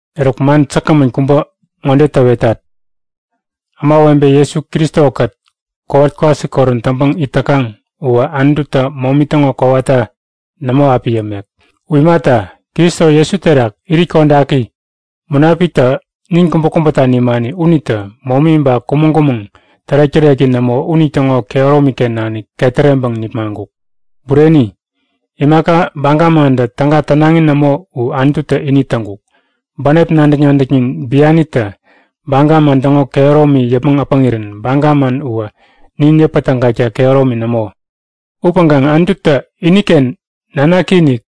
Eruk, man säkgämän kubä ŋode täwetat; Ämawebe Jesu Kristo-kät kowat-kwasikorän täŋpäŋ it täkaŋ uwä Anututä momi täŋo kowata nämo api yämek. U imata, Kristo Jesu terak irit kodaki Munapiktä nin kubäkubäta nimani unitä momi ba kumäŋ-kumäŋ tärek-täreki nämo unitäŋo kehäromi-ken nanik ketäreŋpäŋ nipmaŋkuk. Bureni, imaka baga mantä täga tänaŋi nämo u Anututä ini täŋkuk. Bänep nadäk-nadäknin bianitä baga man täŋo kehäromi yäpmäŋ äpäŋirän baga man uwä nin yäpätägakta kehäromi nämo. Upäŋkaŋ Anututä iniken nanaki-inik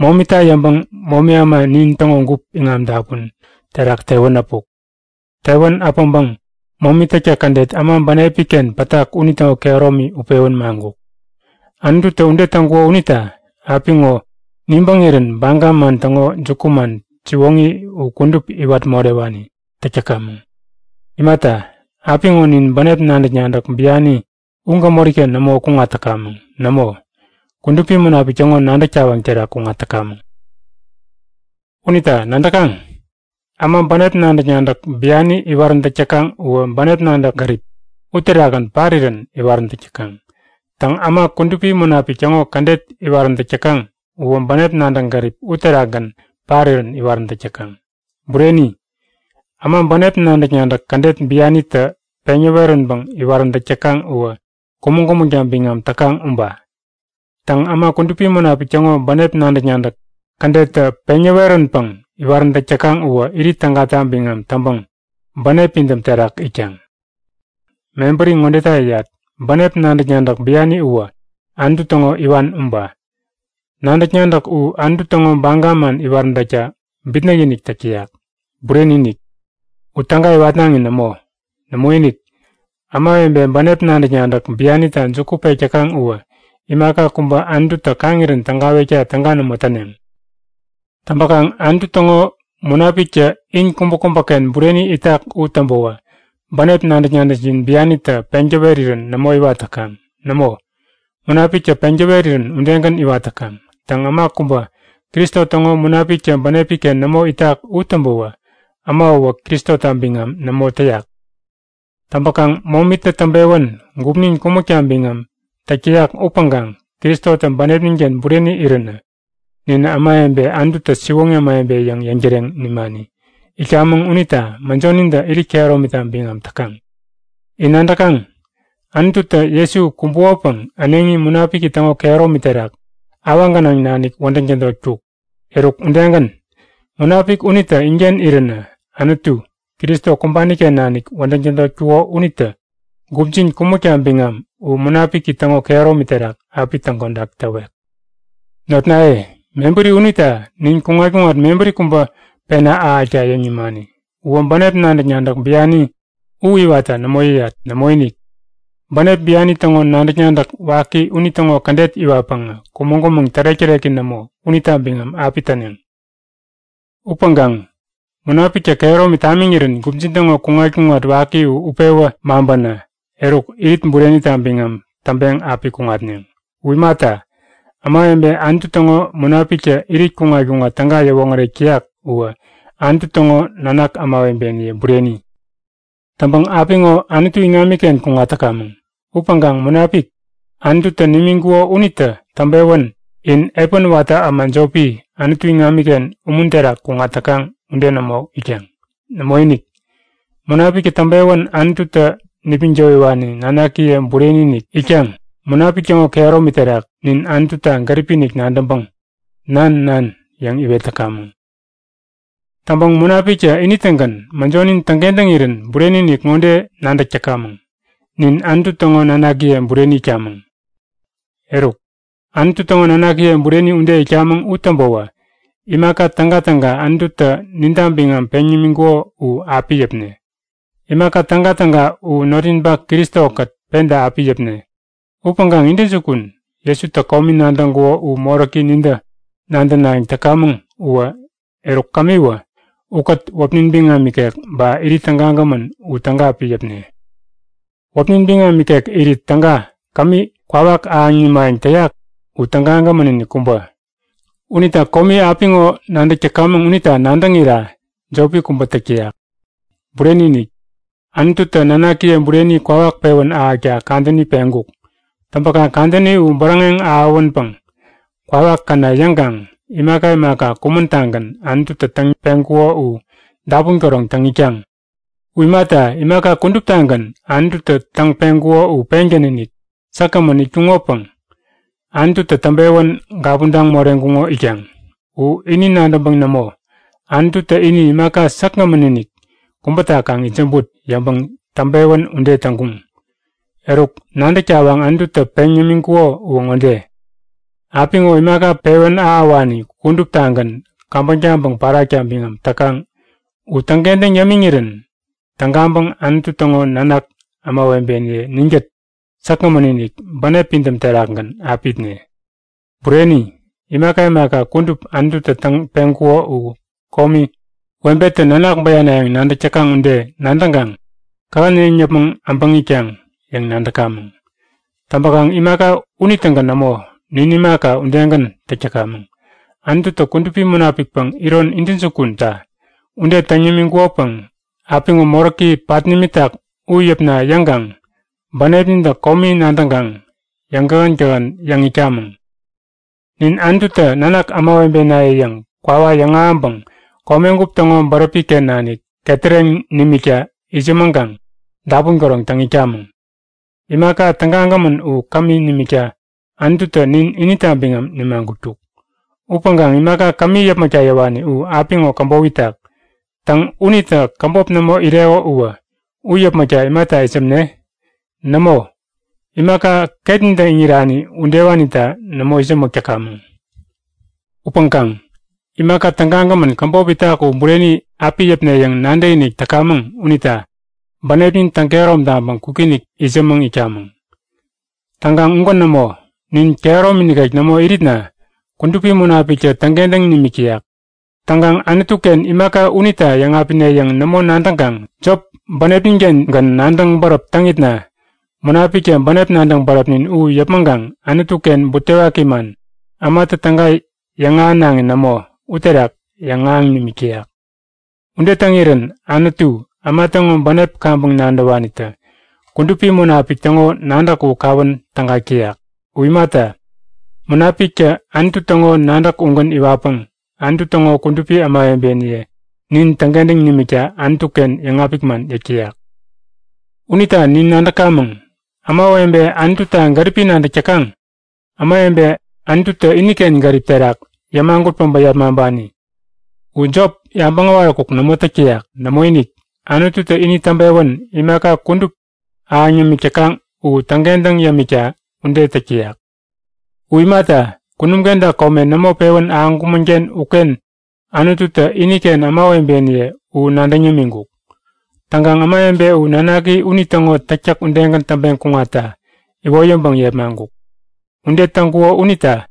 momita yäŋpäŋ momi äma nin täŋo gup iŋam-dapun terak tewän äpuk. Tewän äpäŋpäŋ momi täktäk kädet äma bänepi-ken pätak unitäŋo kehäromi utpewän maŋkuk. Anututä ude täŋkuko unita apiŋo nibäŋirän baga man täŋo jukuman siwoŋi u kudup iwat morewani täk täkaŋ. Imata, apiŋo nin bänep nadäk-nadäk biani u gämori-ken nämo kuŋat täkamäŋ. Nämo, Kudupi Munapik täŋo nadäk tawaŋ terak kuŋat täkamäŋ. Unita nadäkaŋ? Äma bänep nadäk-nadäk biani iwaräntäk täkaŋ uwä bänep nadäk-gäripi uterakgän parirän iwaräntäk täkaŋ. Täŋ, äma Kudupi Munapik täŋo kädet iwaräntäk täkaŋ uwä bänep nadäk-gäripi uterakgän parirän iwaräntäk täkaŋ. Bureni, äma bänep nadäk-nadäk kädet bianitä peŋ yäweränpäŋ iwaräntäk täkaŋ uwä kumäŋ-kumäŋta biŋam täkaŋ uba. Täŋ, äma Kudupi Munapik täŋo bänep nadäk-nadäk kädettä peŋ yäweränpäŋ iwaräntäk täkaŋ uwä irit tägata biŋam täŋpäŋ bänep pidäm terak itkaŋ. Mebäri ŋodeta yäyat; Bänep nadäk-nadäk biani uwä Anutu täŋo iwan uba. Nadäk-nadäk u Anutu täŋo baga man iwaräntäkta bitnäk-inik täk täyak. Bureni-inik, u täga iwatnaŋi nämo. Nämoinik, ämawebe bänep nadäk-nadäk bianita juku pek täkaŋ uwä imaka kubä Anututä kaŋirän tägawekta täga nämo täneŋ. Täŋpäkaŋ Anutu täŋo Munapiktä in kubäkubäken bureni itak u täŋpäwä bänep nadäk-nadäkjin bianitä peŋ täwerirän nämo iwat täkaŋ. Nämo, Munapiktä peŋ täwerirän udegän iwat täkaŋ. Täŋ, äma kubä Kristo täŋo Munapiktä bänepi-ken nämo itak u täŋpäwä äma uwä Kristota biŋam nämo täyak. Täŋpäkaŋ momitä täŋpewän gupnin kumäkta biŋam täk täyak upäŋkaŋ Kristotä bänepnin-ken bureni iränä ninä ämawebe Anututä siwoŋi ämawebe yäŋ yäŋtäreŋ nimani itkamäŋ unita mäjonintä irit kehäromita biŋam täkaŋ. In nadäkaŋ; Anututä Jesu kumbukopäŋ äneŋi Munapiki täŋo kehäromi terak awaŋ gänaŋ nanik wädäŋ tädotkuk. Eruk udegän, Munapik unitä inken iränä Anutu, Kristo kumbani-ken nanik wädäŋ tädotkuko unitä gupjin kumäkta biŋam u Munapiki täŋo kehäromi terak api täŋkodak täwek. Notnaye, mebäri unita nin kuŋat-kuŋat mebäri kubä pena ahäkta yäŋ nimani. Uwä bänep nadäk-nadäk biani u iwatta nämo yäyat. Nämoinik. Bänep biani täŋo nadäk-nadäk waki unitäŋo kädet iwatpäŋä kumäŋ-kumäŋ tärek-täreki nämo unita biŋam api täneŋ. Upäŋkaŋ Munapiktä kehäromi tamiŋirän gupjin täŋo kuŋat-kuŋat waki u utpewä maŋpänä, eruk irit burenita biŋam täŋpeŋ api kuŋatneŋ. U imata, ämawebe Anutu täŋo Munapiktä irit kuŋat-kuŋat täga yäwoŋärek täyak uwä Anutu täŋo nanak ämawebeniye bureni. Täŋpäŋ apiŋo Anutu iŋamiken kuŋat täkamäŋ. Upäŋkaŋ Munapik, Anututä nimiŋkuko unitä täŋpewän in epän watä äma jopi, Anutu iŋamiken umun terak kuŋat täkaŋ ude nämo itkaŋ. Nämoinik! Munapiktä täŋpewän Anututä nipmäŋ towiwani nanakiye bureni-inik itkaŋ Munapik täŋo kehäromi terak nin Anututa gäripi-inik nadäŋpäŋ Nan! Nan! yäŋ iwet täkamäŋ. Täŋpäŋ Munapiktä ini-tägän mäjonin täŋkentäŋirän bureni-inik ŋode nadäk täkamäŋ; Nin Anutu täŋo nanakiye bureni itkamäŋ. Eruk, Anutu täŋo nanakiye bureni ude itkamäŋ u täŋpäwä imaka tägatäga Anututä ninta biŋam peŋ nimiŋkuko u api yäpne. Imaka tägatäga u notninpak Kristo-kät penta api yäpne. Upäŋkaŋ intäjukun, Jesutä komi nadäŋkuko u moräki nintä nadänayäŋ täkamäŋ uwä, eruk kämiwä ukät wäpnin biŋam ikek ba irit tägagämän u täga api yäpne. Wäpnin biŋam ikek irit täga kämi kwawak ahäŋ nimayäŋ täyak u tägagämän-inik kubä. Unita komi apiŋo nadäk täkamäŋ unita nadäŋira jopi kubä täk täyak. Bureni-inik! Anututä nanakiye bureni kwawak pewän ahäkta kadäni peŋkuk. Täŋpäkaŋ kadäni u bäräŋeŋ ahäwänpäŋ kwawak käna yäŋkaŋ imaka imaka kumän-tagän Anututä täŋ-peŋkuko u dapun käroŋ täŋ itkaŋ. U imata, imaka kuduptagän Anututä täŋ-peŋkuko u pengän-inik säkgämän itkuŋopäŋ Anututä täŋpewän gapuntaŋ moreŋkuŋo itkaŋ. U ini nadäŋpäŋ nämo; Anututä ini imaka säkgämän-inik kubäta kaŋ itsämbut yäŋpäŋ täŋpewän ude täŋkuŋ. Eruk nadäk tawaŋ Anututä peŋ yämiŋkuko uwä ŋode; Apiŋo imaka pewän ahäwani kuduptagän käbäŋ taŋpäŋ pärakta biŋam täkaŋ u täŋkentäŋ yämiŋirän tägaŋpäŋ Anutu täŋo nanak ämawebeniye ninkät säkgämän-inik, bänep pidäm terakgän api itne. Bureni, imaka imaka kudup Anututä täŋ-peŋkuko u komi, webetä nanak bäyanayäŋ nadäk täkaŋ ude nadäŋkaŋ kähän yäŋ yäpmäŋ äbäŋ itkaŋ yäŋ nadäkamäŋ. Täŋpäkaŋ imaka unitägän nämo, nin imaka udegän täk täkamäŋ. Anututä Kudupi Munapikpäŋ iron intäjukunta ude täŋ nimiŋkukopäŋ apiŋo moräki pat nimitak u yäpna yäŋkaŋ bänepnintä komi nadäŋkaŋ yäŋkähän-kähän yäŋ itkamäŋ. Nin Anututä Nanak ämawebenaye yäŋ kwawa yäŋahäŋpäŋ komegup täŋo bäräpi-ken nanik ketäreŋ nimikta itsämäŋkaŋ dapun käroŋ täŋ itkamäŋ. Imaka tägagämän u kämi nimikta Anututä nin inita biŋam nimagutkuk. Upäŋkaŋ imaka kämi yäpmäkta yäwani u apiŋo käbop itak. Täŋ, unitä käbop nämo ireko uwä u yäpmäkta imata itsämne? Nämo, imaka ketnintä iŋirani udewanita nämo itsämäk täkamäŋ. Upäŋkaŋ imaka tägagämän käbop itak u bureni api yäpne yäŋ nadäkinik täkamäŋ unita bänepnin täŋkehärom taŋpäŋ kwikinik itsämäŋ itkamäŋ. Täŋkaŋ ugän nämo. Nin kehäromi nikek nämo iritna Kudupi Munapiktä täŋkentäŋ nimik täyak. Täŋkaŋ Anutu-ken imaka unita yäŋapine yäŋ nämo nadäŋkaŋ jop bänepnin-kengän nadäŋ bäräp täŋitna Munapiktä bänep nadäŋ bäräpnin u yäpmäŋkaŋ Anutu-ken butewaki man, ämatä täga yäŋahänaŋi nämo, uterak yäŋahäŋ nimik täyak. Ude täŋirän Anutu, äma täŋo bänep kaŋpäŋ nadäwanitä Kudupi Munapik täŋo nadäk u kawän tägak täyak. U imata, Munapiktä Anutu täŋo nadäk ugän iwatpäŋ Anutu täŋo kudupi ämawebeniye nin täŋkentäŋ nimikta Anutu-ken yäŋapik man yäk täyak. Unita nin nadäkamäŋ; Ämawebe Anututa gäripi nadäk täkaŋ, ämawebe Anututä iniken gärip terak yämagut päbä yepmaŋpani u jop yabäŋ äwaräkuk nämo täk täyak. Nämoinik, Anututä ini täŋpewän imaka kudup ahäŋ yämik täkaŋ u täŋkentäŋ yämikta ude täk täyak. U imata, kunum kenta kome nämo pewän ahäŋkumän-ken uken Anututä iniken ämawebeniye u nadäŋ yämiŋkuk. Täŋkaŋ ämawebe u Nanaki unitäŋo täktäk udegän täŋpeŋ kuŋatta iwoyäŋpäŋ yepmaŋkuk. Ude täŋkuko unita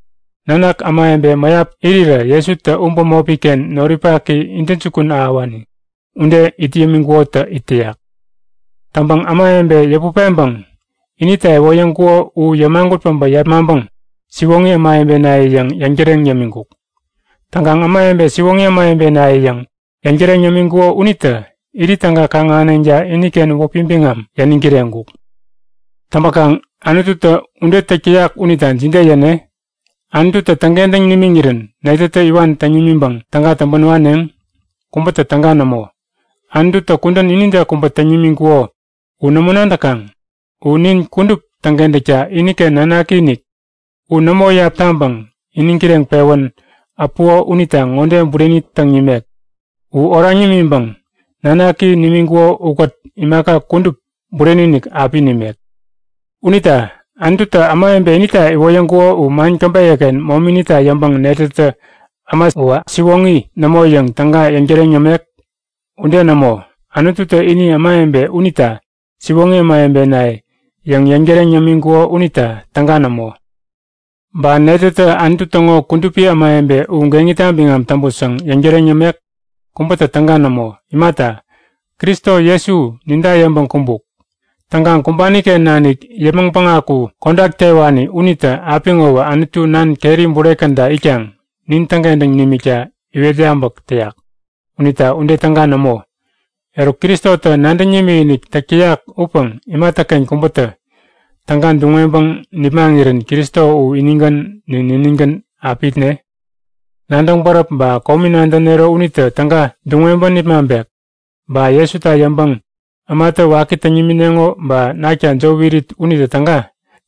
nanak ämawebe mäyap irirä Jesutä u bämopi-ken noripaki intäjukun ahäwani ude it yämiŋkukotä it täyak. Täŋpäŋ ämawebe yäput peŋpäŋ inita iwoyäŋkuko u yämagut päbä yepmaŋpäŋ siwoŋi ämawebenaye yäŋ yäŋtäreŋ yämiŋkuk. Täŋkaŋ ämawebe siwoŋi ämawebenaye yäŋ yäŋtäreŋ yämiŋkuko unitä irit täga kaŋ-ahäneŋta iniken wäpi biŋam yäniŋ kireŋkuk. Täŋpäkaŋ Anututä ude täk täyak unita jide yäne? Anututä täŋkentäŋ nimiŋirän netätä iwan täŋ nimiŋpäŋ täga täŋpän waneŋ? Kubätä täga nämo! Anututä kudän inide kubä täŋ nimiŋkuko u nämo nadäkaŋ? U nin kudup täŋkentäkta iniken nanaki-inik u nämo iyap taŋpäŋ iniŋ kireŋpewän äpuko unita ŋode bureni täŋ nimek; U oraŋ nimiŋpäŋ nanaki nimiŋkuko ukät imaka kudup bureni-inik api nimek! Unita Anututä ämawebe inita iwoyäŋkuko u man käbeyä-ken mominita yäŋpäŋ netätä äma uwä siwoŋi nämo yäŋ täga yäŋtäreŋ yämek? Ude nämo! Anututä ini ämawebe unita siwoŋi ämawebe yäŋ yäŋtäreŋ yämiŋkuko unita täga nämo! Ba netätä Anutu täŋo kudupi ämawebe u geŋita biŋam täŋput yäŋ yäŋtäreŋ yämek? Kubätä täga nämo! Imata, Kristo Jesu ninta yäŋpäŋ kumbuk. Täŋkaŋ kumbani-ken nanik yäpmäŋ päŋaku kodak tewani unitä apiŋowä Anutu nan keri bure käda itkaŋ nin täŋkentäŋ nimikta iwet yabäk täyak unita ude täga nämo. Eruk Kristotä nadäŋ nimikinik täk täyak upäŋ imatäken kubätä täga duŋ-weŋpäŋ nipmaŋirän Kristo u inigän nin niningän api itne? Nadäŋ-bäräp ba komi nadänero unitä täga duŋ-weŋpäŋ nipmaŋpek? Ba Jesuta yäŋpäŋ ämatä waki täŋ nimineŋo ba nakta jop irit unitä täga?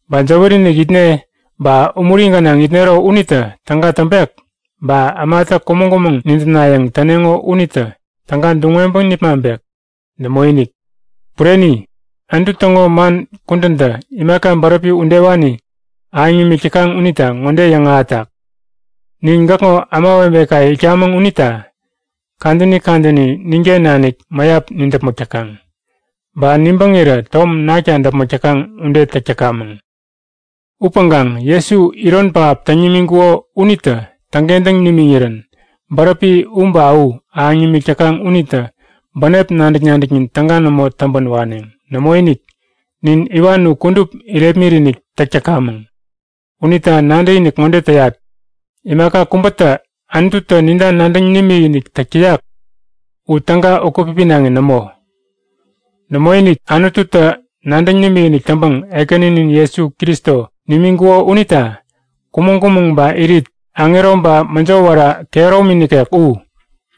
Ba jäwäri-inik itne ba umuri gänaŋ itnero unitä täga täŋpek? Ba ämatä kumäŋ-kumäŋ nidäpnayäŋ täneŋo unitä täga duŋ-weŋpäŋ nipmaŋpek? Nämoinik! Bureni, Anutu täŋo man kudäntä imaka bäräpi udewani ahäŋ nimik täkaŋ unita ŋode yäŋahätak; Nin gäkŋo ämawebekaye itkamäŋ unita kadäni kadäni ninken nanik mäyap nidäpmäk täkaŋ. Ba nibäŋirä tom nakta däpmäk täkaŋ ude täk täkamäŋ. Upäŋkaŋ Jesu iron pähap täŋ nimiŋkuko unitä täŋkentäŋ nimiŋirän bäräpi u ba u ahäŋ nimik täkaŋ unitä bänep nadäk-nadäknin täga nämo täŋpän waneŋ. Nämoinik! Nin iwan u kudup irepmit-inik täk täkamäŋ. Unita nadäkinik ŋode täyat; Imaka kubätä Anututä ninta nadäŋ nimikinik täk täyak u täga ukät-pipinaŋi nämo. Nämoinik! Anututä nadäŋ nimikinik täŋpäŋ Ekäninin Jesu Kristo nimiŋkuko unita kumäŋ-kumäŋ ba irit, aŋero ba mäjo wära kehäromi nikek u,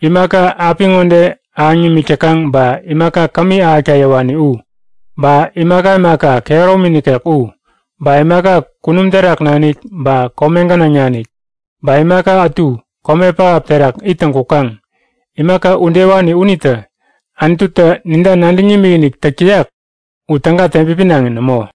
imaka apiŋode ahäŋ nimik täkaŋ ba imaka kämi ahäkta yäwani u, ba imaka imaka kehäromi nikek u, ba imaka kunum terak nanik ba kome gänaŋ nanik ba imaka ätu kome pähap terak ittäŋ kukaŋ, imaka udewani unitä Anututä ninta nadäŋ nimikinik täk täyak u täga teŋpipinaŋi nämo.